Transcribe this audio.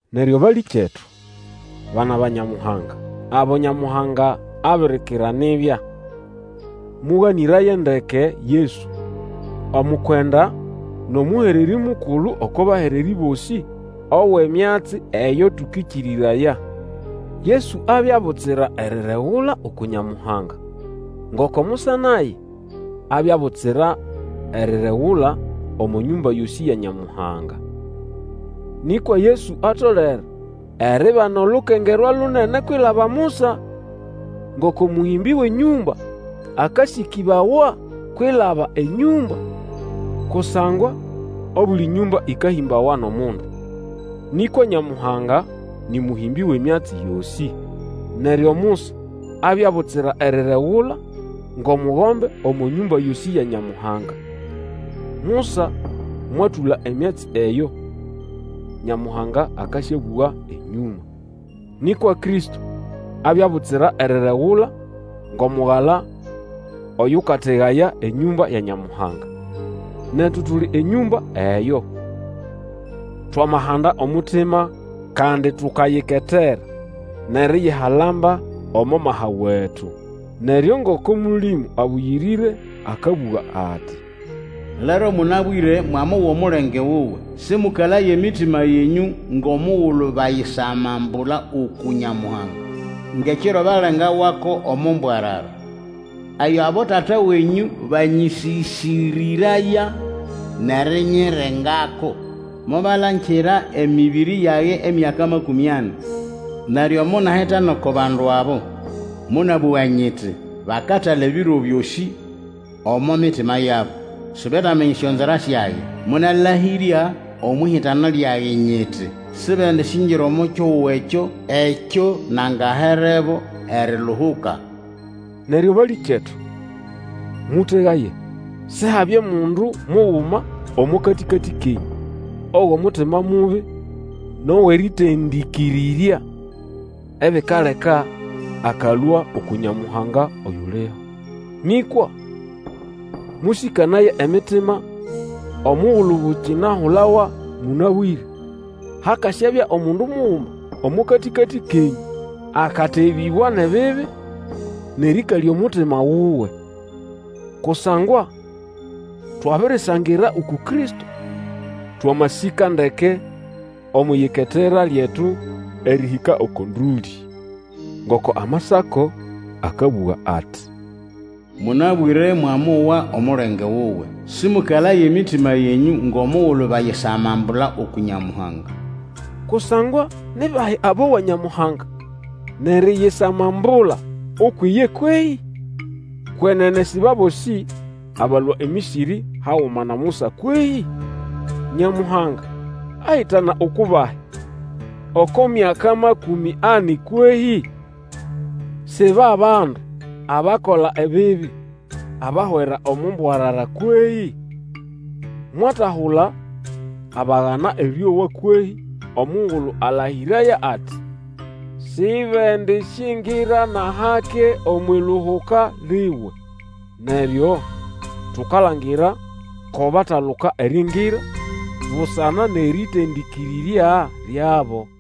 Neryo balĩkyetu, bana ba Nyamuhanga, abo Nyamuhanga abirikira nibya, mũganĩraye ndeke Yesu, omukwenda nʼomũhererĩ mukulu oko bahererĩ bosĩ, owʼemyatsi eyo tũkĩkĩrĩraya. Yesu abya butsira eriregula uku Nyamuhanga, ngoko Musa naye abya butsira eriregula omo nyũmba yosĩ ya Nyamuhanga. Nĩkwa Yesu atolere eribana olukengerwa lunene kwilaba Musa, ngoko mũlũmbĩ wʼenyũmba akasĩkĩbawa kwilaba enyũmba. Kusangwa obuli nyũmba ĩkahĩmbawa nʼomundu, nĩkwa Nyamuhanga nĩ mũhĩmbĩ wʼemyatsi yosĩ. Neryo Musa abya butsira eriregula ngʼomugombe omo nyũmba yosĩ ya Nyamuhanga; Musa mwatũla emyatsi eyo Nyamuhanga akasyabũga enyũma. Nĩkwa Kristo abya butsira eriregula ngʼomugala oyũkategaya enyũmba ya Nyamuhanga. Netu tuli enyũmba eyo, twamahanda omutima, kandi tukayiketera nʼeriyihalamba omo maha wetu. Neryo, ngoko Mũlĩmũ Abũyĩrĩre akabũga ati, Lero mũnabwĩre, mwamowa omulenge wuwe, Sĩmũkalaye emitima yenyũ ngʼomugulu bayisamambula uku Nyamuhanga. Ngʼekiro balengawako omo mbwarara. Eyo abotata wenyũ banyĩsĩsĩrĩraya nʼerinyirengako. Mobalangira emĩbĩrĩ yage emyaka makũmĩ ani. Neryo monahitana oko bandu abo, Monabũga nyiti, Bakatala ebiro byosĩ omo mitima yabo; Sibetaminya esyonzira syage. Monalahĩrya omwʼihitana lyage nyiti, Sibendisyingira omo kihugo ekyo, Ekyo nangaherebo eriluhuka. Neryo balĩkyetu, mũtegaye, Sihabye mundu muguma omo katĩkatĩ kenyũ, owʼomutima mubi nʼowʼerĩtendĩkĩrĩrya, ebikaleka akalũa uku Nyamuhanga oyuliho. Nĩkwa mũsĩkanaye emitima omugulu bukinahulawa mũnabwĩre, hakasyabya omundu muguma omo katĩkatĩ kenyũ akatebĩbwa nʼebibi nʼerĩkalya omutima wuwe. Kusangwa twabirisangira uku Kristo, twamasĩka ndeke omwʼiyiketera lyetu erĩhĩka oko ndũlĩ. Ngoko Amasako akabũga ati, Mũnabwĩre mwamowa omulenge wuwe, Sĩmũkalaye emitima yenyũ ngʼomugulu bayisamambula uku Nyamuhanga. Kusangwa ni bahi abowa Nyamuhanga, nʼeriyisamambula ukwʼiye kwehĩ? Kwenene si ba bosĩ abalũa eMĩsĩrĩ haguma na Musa kwehĩ? Nyamuhanga ahitana uku bahi oko myaka makũmĩ ani kwehĩ? Si ba bandu abakola ebibi abahwera omo mbwarara kwehĩ? Mwatahula abagana erĩowa kwehĩ omugulu alahĩrĩraya ati, Sibendisyingira nʼahake omwʼiluhuka liwe. Neryo tukalangira ko bataluka eriingira busana nʼerĩtendĩkĩrĩrya lyabo.